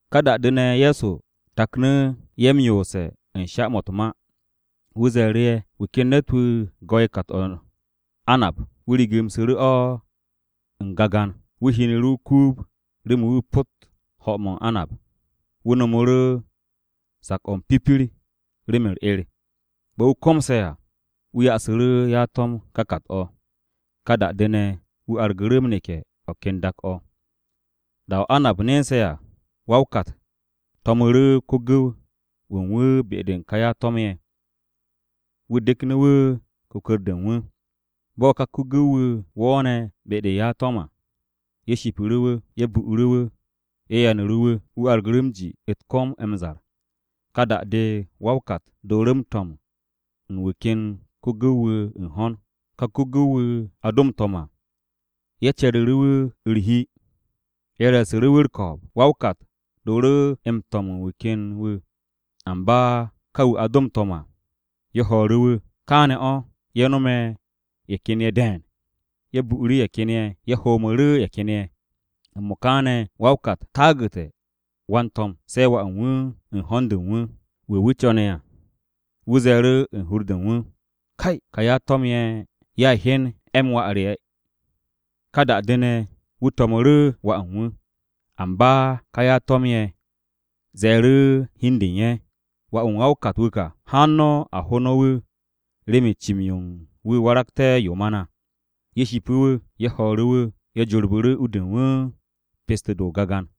Ka da-de ne̱, Ye̱so taknu̱ ye̱ m-yoose̱ u̱n sha-mo̱ u̱t-ma. Wu̱ ze̱e̱ru̱ ye̱, “Wu̱ ken ne̱t-wu̱ go̱'e̱ kat-o̱ u̱n anab. Wu̱ rigimsu̱ru̱ o̱ u̱n gagan. Wu̱ hinu̱ru̱ o-kuub remen wu̱ pot ho̱-mo̱ u̱n anab. Wu̱ no̱mu̱ru̱ sak-o̱ m-pipir remen u̱r-'er. Bo̱ wu̱ komse̱ à, wu̱ ya'asu̱ru̱ ya-to̱m ka kat-o̱. Ka da-de ne̱, wu̱ argu̱ru̱ m-neke̱ o̱ ken dak-o̱. Da-o̱ anab nense̱ à, wa-o-kat to̱mu̱ru̱ ko-gu̱w-wu̱ u̱n wu̱ be-de u̱n ka ya-to̱m-ye̱, wu̱ deknu̱ wu̱ kwu̱kwu̱r-de u̱n wu̱. Bo̱ ka ko-gu̱w-wu̱ wo̱o̱ne̱ be-de u̱n ya-to̱m à, ye̱ shipu̱ru̱ wu̱. Ye̱ bu'u̱ru̱ wu̱, ye̱ yanu̱ru̱ wu̱. Wu̱ argu̱ru̱ m-ji u̱t-kom m-zar. Ka da-de, wa-o-kat dooru̱ m-to̱m u̱n wu̱ ken ko-gu̱w-wu̱ u̱n ho̱n. Ka ko-gu̱w-wu̱ a do m-to̱m à, ye̱ ce̱ru̱ru̱ wu̱ u̱r-hi. Ye̱ reesu̱ru̱ wu̱ u̱r-ko̱o̱b. Wa-o-kat dooru̱ m-to̱m u̱n wu̱ ken wu̱. Amba ka wu̱ a do m-to̱m à, ye̱ ho̱o̱ru̱ wu̱. Kaane̱ o̱, ye̱ nome̱ ye̱ ken ye̱ de̱e̱n. Ye̱ bu'u̱ru̱ ye̱ ken ye̱, ye̱ homu̱ru̱ ye̱ ken ye̱. “M-mo̱ka ne̱ wa-o-kat taagu̱te̱ wan-to̱m, se̱ wà u̱n wu̱ u̱n ho̱n-de u̱n wu̱, wu̱ wu̱ co̱ne̱ à. Wu̱ ze̱e̱ru̱ u̱n hur-de u̱n wu̱, ‘Kay, ka ya-to̱m-ye̱ ye̱a hyen 'e̱-m wà re.’ Ka da-de ne̱, wu̱ to̱mu̱ru̱ wà u̱n wu̱. “Amba ka ya-to̱m-ye̱ ze̱e̱ru̱ u̱n hi u̱n de u̱n ye̱, ‘Wà-wu̱ u̱n wa-o-kat-wu̱ ka. Haan no̱ a ho no̱ wu̱ remen cim-yo u̱n wu̱ waragté̱ yo ma na.’ Ye̱ shipu̱ wu̱. Ye̱ ho̱o̱ru̱ wu̱. Ye̱ jorbu̱ru̱ u-de u̱n wu̱ pesto-de o-gagan.”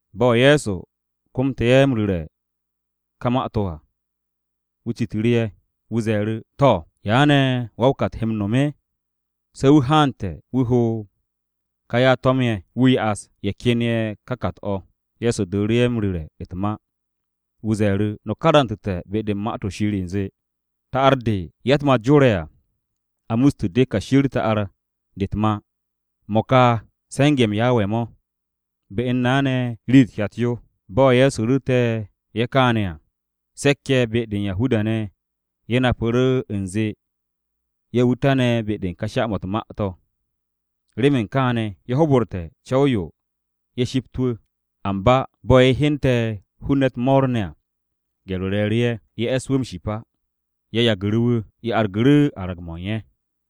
Bo̱ Ye̱so komte̱ ye̱ m-ru̱re̱ u̱n ka ma-to̱ à, wu̱ citu̱ru̱ ye̱. Wu̱ ze̱e̱ru̱, “To̱, ¿ya ne̱ wa-o-kat he m-no̱m? Se̱ wu̱ haante̱ wu̱ ho-m ka ya-to̱m-ye̱, wu̱ ya'as ye̱ ken ye̱ ka kat-o̱.” Ye̱so dooru̱ ye̱ m-ru̱re̱ u̱t-ma. Wu̱ ze̱e̱ru̱, “No̱ karantu̱te̱ be-de u̱n Ma-to̱ Shir u̱nze, “ ‘Ta'ar-de ya-u̱t-ma jore̱ à, a muste̱ de kashi u̱r-ta'ar de u̱t-ma. Mo̱ ka se̱nge̱-mo̱ u̱n Yawe mo̱. Be u̱n na ne̱ rii-yo u̱t-hyat yo.’” Bo̱ Ye̱so ru̱ru̱te̱ ye̱ kaane̱ à, se̱k-ye̱ be-de u̱n Yahuda-ne̱ ye̱ napu̱ru̱ u̱nze ye̱ wu̱ tane̱ be-de u̱n ka sha-mo̱ u̱t-ma to̱. Remen kaane̱, ye̱ hoborte̱ o-co̱w ye̱ shipt wu̱. Amba bo̱ ye̱ hyente̱ hun-ne̱ u̱t-mo̱o̱r ne̱ à, gye̱r-o re̱e̱ru̱ ye̱. Ye̱ e̱s wu̱ m-ship á. Ye̱ yagu̱ru̱ wu̱. Ye̱ argu̱ru̱ arag-mo̱ u̱n ye̱.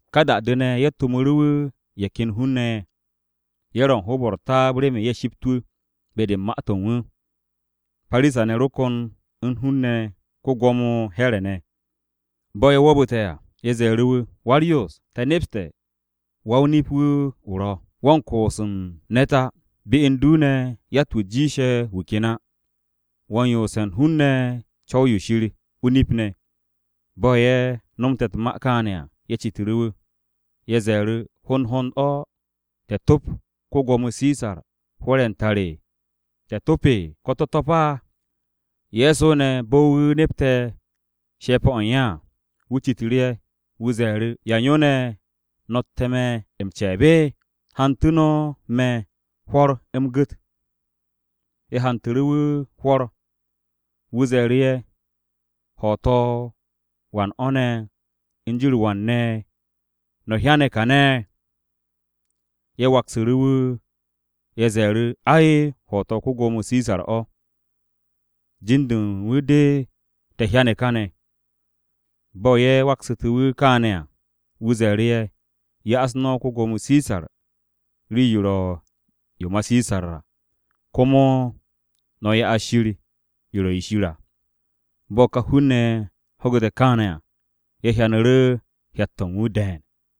Ka da-de ne̱, ye̱ to̱mu̱ru̱ wu̱ ye̱ ken hun-ne̱ ye̱. Ye̱ ro u̱n hoob-o̱ u̱r-taab remen ye̱ shipt wu̱, be-de u̱n ma-to̱ u̱n wu̱. Parisa-ne̱ ro kon u̱n hun-ne̱ ko-Gwo̱mo Here̱ ne̱. Bo̱ ye̱ wo̱o̱bu̱te̱ à, ye̱ ze̱e̱ru̱ wu̱, “Wa-u̱r-Yoos, te̱ nepste̱ wo̱ wa-o-nip-wu̱ o ro̱. Wo̱ u̱n koos u̱n ne̱t á. Be u̱n du ne̱ yatt-wu̱ jiishe̱ wu̱ ken á. Wo̱ u̱n yoose̱ u̱n hun-ne̱ co̱w-yo Shir o-nip ne̱.” Bo̱ ye̱ nomte̱ u̱t-ma kaane̱ à, ye̱ citu̱ru̱ wu̱. Ye̱ ze̱e̱ru̱, “¿Hond hond o̱ te̱ to̱p ko-Gwo̱mo Sisar hwo̱r-ye̱ u̱n tar? ¿Te̱ to̱p, ko̱ te̱ to̱p á?” Ye̱so ne̱, bo̱ wu̱ nepte̱ she̱pe̱-o̱ u̱n ye̱ à, wu̱ citu̱ru̱ ye̱. Wu̱ ze̱e̱ru̱, “¿Ya u̱n yo ne̱ no̱tte̱ me̱ m-ce̱e̱b? Hantu̱ no̱ me̱ hwo̱r u̱m gu̱t.” Ye̱ hantu̱ru̱ wu̱ hwo̱r. Wu̱ ze̱e̱ru̱ ye̱, “¿Ho̱to̱-o wan o̱ ne̱ u̱n jin-u̱r wan ne̱ no̱ hyane̱ káne̱?” Ye̱ waksu̱ru̱ wu̱. Ye̱ ze̱e̱ru̱, “Ai, ho̱to̱-o ko-Gwo̱mo Sisar o̱. Jin-de u̱n wu̱ de te̱ hyane̱ káne̱.” Bo̱ ye̱ waksu̱te̱ wu̱ kaane̱ à, Ye̱so ze̱e̱ru̱ ye̱, “Ya'as no̱ ko-Gwo̱mo Sisar rii-yo ro̱ yo ma Sisar à. Komo no̱ ya'as Shir rii-yo ro̱ yo Shir à.” Bo̱ ka hun-ne̱ ye̱ ho̱gu̱te̱ káane̱ à, ye̱ hyanu̱ru̱ hyat-to̱ u̱n wu̱ de̱e̱n.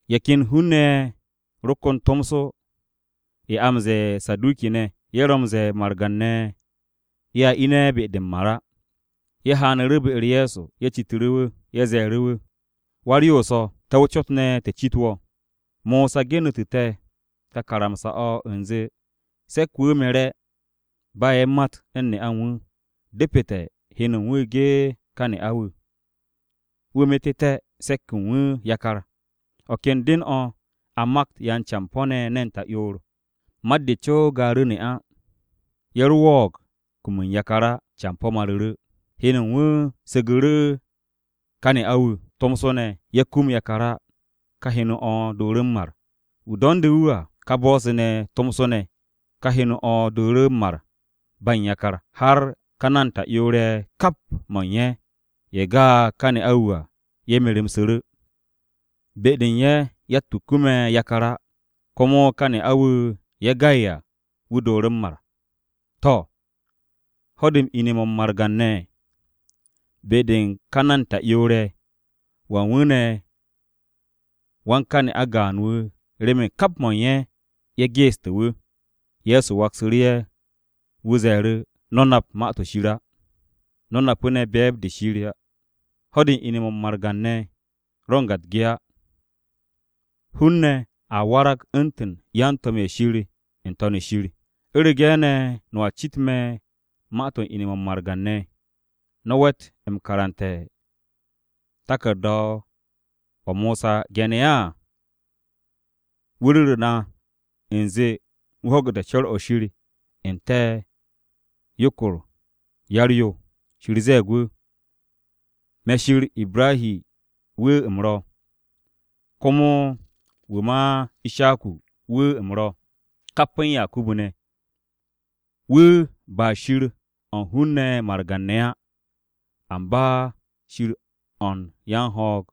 Ye̱ ken hun-ne̱ ye̱ ro kon tomso. A ye̱ m-ze̱e̱ Saduki-ne̱. (Ye̱ ro̱ m-ze̱e̱ margan-ne̱ ye̱a ine̱ be-de m-mar á.) Ye̱ haanu̱ru̱ be-u̱r Ye̱so. Ye̱ citu̱ru̱ wu̱. Ye̱ ze̱e̱ru̱ wu̱, “Wa-u̱r-Yoos o̱, te̱ o-cot ne̱ te̱ cit wo̱. Mosa genu̱tu̱ te̱ ka karamsa-o̱ u̱nze se̱k-wu̱ mere̱, ba ye̱ u̱n mat u̱n ne'a u̱n wu̱, depete̱ heno u̱n wu̱ ge ka ne'a-wu̱, wu̱ metu̱té̱ se̱k-wu̱ yakar. O̱ ken den-o̱, a makt yan-campo̱-ne̱ ne̱n ta'yoor. Mat-de co gaaru̱ ne'a. Ye̱ ro wo̱o̱g kum u̱n yakar á, campo̱ maru̱ru̱. Heno u̱n wu̱ su̱gu̱ru̱ ka ne'a-wu̱. Tomso ne̱, ye̱ kum yakar á, ka heno-o̱ dooru̱ m-mar. Wu̱ do̱nde̱ wu̱ à, ká bo̱-se ne̱ tomso ne̱, ka heno-o̱ dooru̱ m-mar ba u̱n yakar. Har ka ne̱n ta'yoor-ye̱, kap mo̱ u̱n ye̱, ye̱ ga'e̱ ka ne'a-wu̱ à, ye̱ meru̱msu̱ru̱. Be-de u̱n ye̱ yatt-wu̱ kume̱ yakar á. Komo ká ne'a-wu̱ ye̱ ga'e̱ à, wu̱ dooru̱ m-mar. To̱, ho̱-de m-ine̱ mo̱ u̱n margan-ne̱, be-de u̱n ka ne̱n ta'yoor-ye̱, ¿wan wu̱ ne̱ wan ka ne'a gaan wu̱ remen kap mo̱ u̱n ye̱, ye̱ geeste̱ wu̱?” Ye̱so waksu̱ru̱ ye̱, wu̱ ze̱e̱ru̱, “No̱ nap Ma-to̱ Shir á. No̱ napu̱ ne̱ be̱e̱b-de Shir á. Ho̱-de m-ine̱ mo̱ u̱n margan-ne̱ a u̱n ga u̱t-ge á. Hun-ne̱ a warag u̱ntu̱n yan-to̱m-ye̱ Shir n-To̱n shir. U̱rege̱ ne̱ no̱a cit me̱ ma-to̱ u̱n ine̱-mo̱ u̱n margan-ne̱, ¿No̱ we̱t m-karante̱ taku̱rda-o̱ Mosa ge̱ne̱ á? Wu̱ ru̱ru̱ na u̱nze wu̱ ho̱gu̱te̱ co̱r-o̱ Shir n-te̱ yokor-o yar-yo. Shir ze̱e̱g wu̱, ‘Me̱ Shir Ibrahi wu̱ u̱m ro̱. Komo wu̱ ma Ishaku wu̱ u̱m ro̱, kap u̱n Yakubu ne̱.’ Wu̱ ba Shir o̱ u̱n hun-ne̱ margan-ne̱ á, amba Shir o̱ u̱n yan-ho̱o̱g.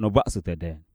No̱ ba'asu̱te̱ de̱e̱n.”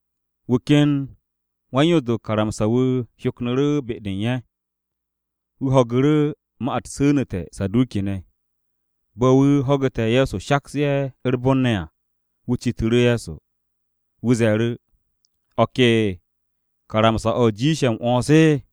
Wu̱ ken wan-Yoos-de u̱n karamsa-o Mosa wu̱ hyoknu̱ru̱ be-de u̱n ye̱. Wu̱ ho̱gu̱ru̱ ma-u̱t su̱nu̱te̱ Saduki-ne̱. Bo̱ wu̱ ho̱gu̱te̱ Ye̱so shaks ye̱ u̱r-bon ne̱ à, wu̱ citu̱ru̱ Ye̱so. Wu̱ ze̱e̱ru̱, “¿O̱ ke karamsa-o̱ jiishe̱ m-'wo̱ns?”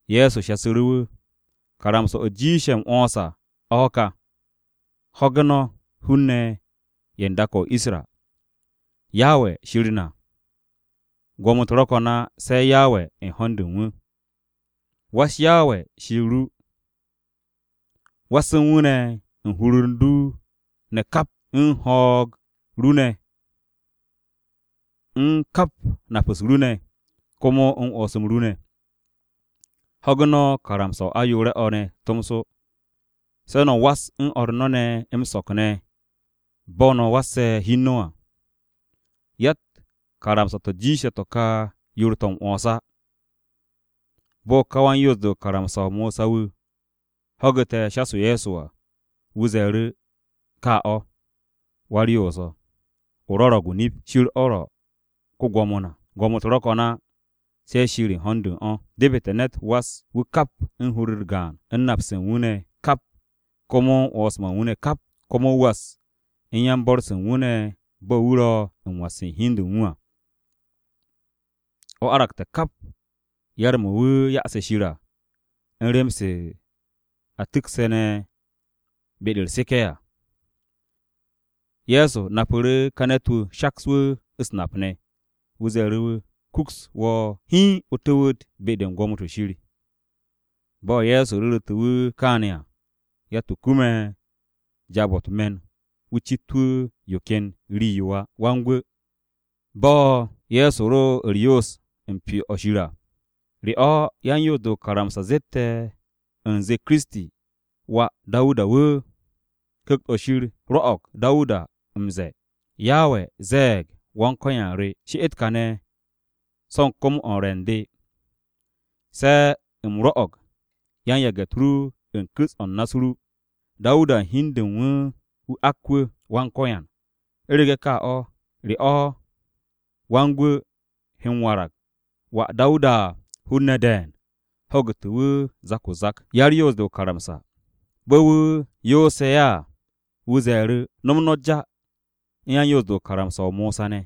Ye̱so ze̱e̱ru̱ wu̱, “Karamsa-o̱ jiishe̱ m-'wo̱ns à, o̱ ka: ‘Ho̱ge̱ no̱ hun-ne̱ ye̱ u̱n dak-o̱ o-Isra! Yawe Shir na. Gwo̱mo-u̱t ro̱ ko̱n á, se̱ Yawe u̱n ho̱n-de u̱n Wu̱. Was Yawe Shir ru. Was u̱n wu̱ ne̱ u̱n hur-u̱r u̱n du ne̱ kap, u̱n kap o̱ u̱n ho̱o̱g ru ne̱, u̱n kap nap-u̱s ru ne̱, komo u̱n 'wo̱ns-m ru ne̱.’ Ho̱ge̱ no̱ karamsa-o ayoore̱-o̱ tomso ne̱, ‘Se̱ no̱ was o̱r no̱ ne̱ m-so̱k ne̱ bo̱ no̱ wasse̱ hi u̱n no̱ à.’ Yatt karamsa-to̱ jiishe̱ to̱ ka yoor-to̱ m-'wo̱ns á.” Bo̱ ka wan-Yoos-de u̱n karamsa-o Mosa wu̱, ho̱gu̱te̱ shas-o Ye̱so à, wu̱ ze̱e̱ru̱, “Ka o̱, Wa-u̱r-Yoos, o rwo̱ro̱g o-nip. Shir o̱ ro̱ ko-Gwo̱mo na. Gwo̱mo-u̱t ro̱ ko̱n á, se̱ Shir u̱n ho̱n-de u̱n o̱. Depete̱ ne̱t was wu̱ kap u̱n hur-u̱r gaan, u̱n nap-se u̱n wu̱ ne̱ kap komo u̱n 'wo̱ns-mo̱ u̱n wu̱ ne̱ kap, komo wu̱ was u̱n yan-bo̱r-se u̱n wu̱ ne̱ bo̱ wu̱ ro̱ m-was u̱n hi u̱n de u̱n wu̱ à. O̱ aragte̱ kap yar-mo̱ wu̱ ya'ase̱ Shir à u̱n rem-se a tu̱kse̱ ne̱ be-de u̱r-seke̱ à.” Ye̱so napu̱ru̱ ka ne̱t-wu̱ shaks wu̱ u̱s-nap ne̱. Wu̱ ze̱e̱ru̱ wu̱, “Kuks wo̱ hiin o tu̱wu̱t be-de u̱n gwo̱mo-to̱ Shir.” Bo̱ Ye̱so ru̱ru̱tu̱ wu̱ kaane̱ à, yatt-wu̱ kume̱ jaab-o̱ u̱t-me̱n wu̱ cit wu̱ yo ken rii-yo á. Bo̱ Ye̱so ro u̱r-yoos u̱n Pyo-o̱ Shir à, wu̱ citu̱ru̱ o-cot, “¿Re o̱ yan-Yoos-de o-karamsa zette̱ u̱nze Kiristi, wà Dawuda wu̱? Ku̱kt-o̱ Shir rwo̱'o̱g Dawuda m-ze̱e̱: “ ‘Yawe ze̱e̱g Wan-Ko̱yan re: “She'et kàne̱ so̱ u̱n kom-o̱ u̱n re̱ u̱n de se̱ u̱m rwo̱'o̱g yan-yage̱-u̱t ru u̱n ku̱s-o̱ u̱n na-o ru.” ’ Dawuda u̱n hi u̱n de u̱n wu̱ ak wu̱, ‘Wan-Ko̱yan,’ u̱rege̱ ka o̱, ¿Re o̱ Wan-Gwu̱ he m-warag wà Dawuda?” Hun-ne̱ de̱e̱n ho̱gu̱te̱ wu̱ zak-o-zak. Bo̱ wu̱ yoose̱ ye̱ à, wu̱ ze̱e̱ru̱, “No̱m no̱ ja u̱n yan-Yoos-de u̱n karamsa-o Mosa ne̱,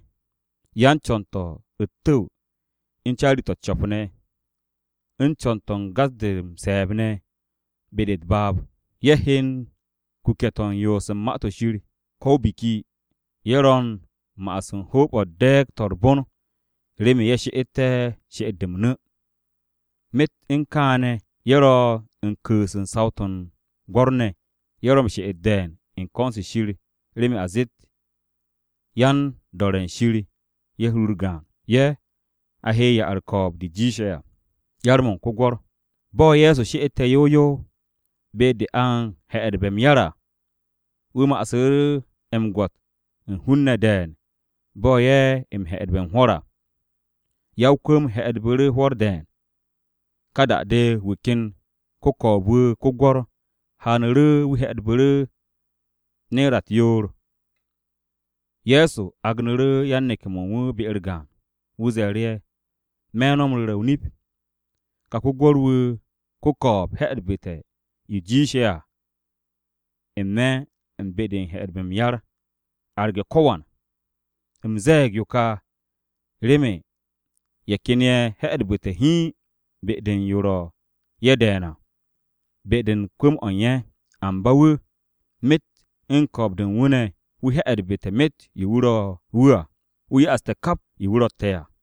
yan-co̱n-to̱ u̱t-tu̱w u̱n carri-to̱ u̱t-co̱p ne̱, u̱n co̱n-to̱ u̱n gas-de m-se̱e̱b ne̱ be-de u̱t-baab. Ye̱ he u̱n kuke̱-to̱ u̱n yoos u̱n Ma-to̱ Shir, ko̱ o-biki, ye̱ ro̱ u̱n ma'as u̱n hoob-o̱ u̱n de̱e̱g-to̱ u̱r-bon remen ye̱ she'etté̱ she'et-de m-nu̱. Myet u̱n kaane̱ ye̱ ro̱ u̱n ku̱u̱s u̱n saw-to̱ u̱n gwo̱r-ne̱. Ye̱ ro̱ m-she'et de̱e̱n u̱n ko̱n-se Shir remen a zeet ye̱ yan-do̱re̱ u̱n Shir ye̱ hur-u̱r gaan. Ye̱, a he ya-u̱r-ko̱o̱b de jiishe̱ à.” Bo̱ Ye̱so she'ete̱ yow yow be-de a u̱n he̱'e̱dbe̱ m-yar à, wu̱ ma'asu̱ m-gwo̱t u̱n hun-ne̱ de̱e̱n bo̱ ye̱ m-he̱'e̱dbe̱ u̱n hwo̱r à. Ya-o-kwu̱m he̱'e̱dbu̱ru̱ hwo̱r de̱e̱n. Ka da-de, wu̱ ken ko-ko̱o̱b-wu̱ ko-gwo̱r haanu̱ru̱ wu̱ he̱'e̱dbu̱ru̱ ne̱ra u̱t-yoor. Ye̱so agnu̱ru̱ yan-neke̱-mo̱ u̱n wu̱ be-u̱r gaan. Wu̱ ze̱e̱ru̱ ye̱, “Me̱ no̱ m-ru̱re̱ o-nip, ka ko-gwo̱r-wu̱ ko-ko̱o̱b he̱'e̱dbu̱te̱ yo jiishe̱ à n-me̱ u̱n be-de a he̱'e̱dbe̱ m-yar, arge̱ ko̱wan. U̱m ze̱e̱g yo kà remen ye̱ ken ye̱ he̱'e̱dbu̱te̱ hiin be-de u̱n yo ro̱ ye̱ de̱e̱n à be-de u̱n kwu̱m-o̱ u̱n ye̱. Amba wu̱, myet u̱n ko̱o̱b-de u̱n wu̱ ne̱ wu̱ he̱'e̱dbu̱te̱ myet yo ro̱ wu̱ à. Wu̱ ya'aste̱ kap yo wu̱ ro̱tte̱ à.”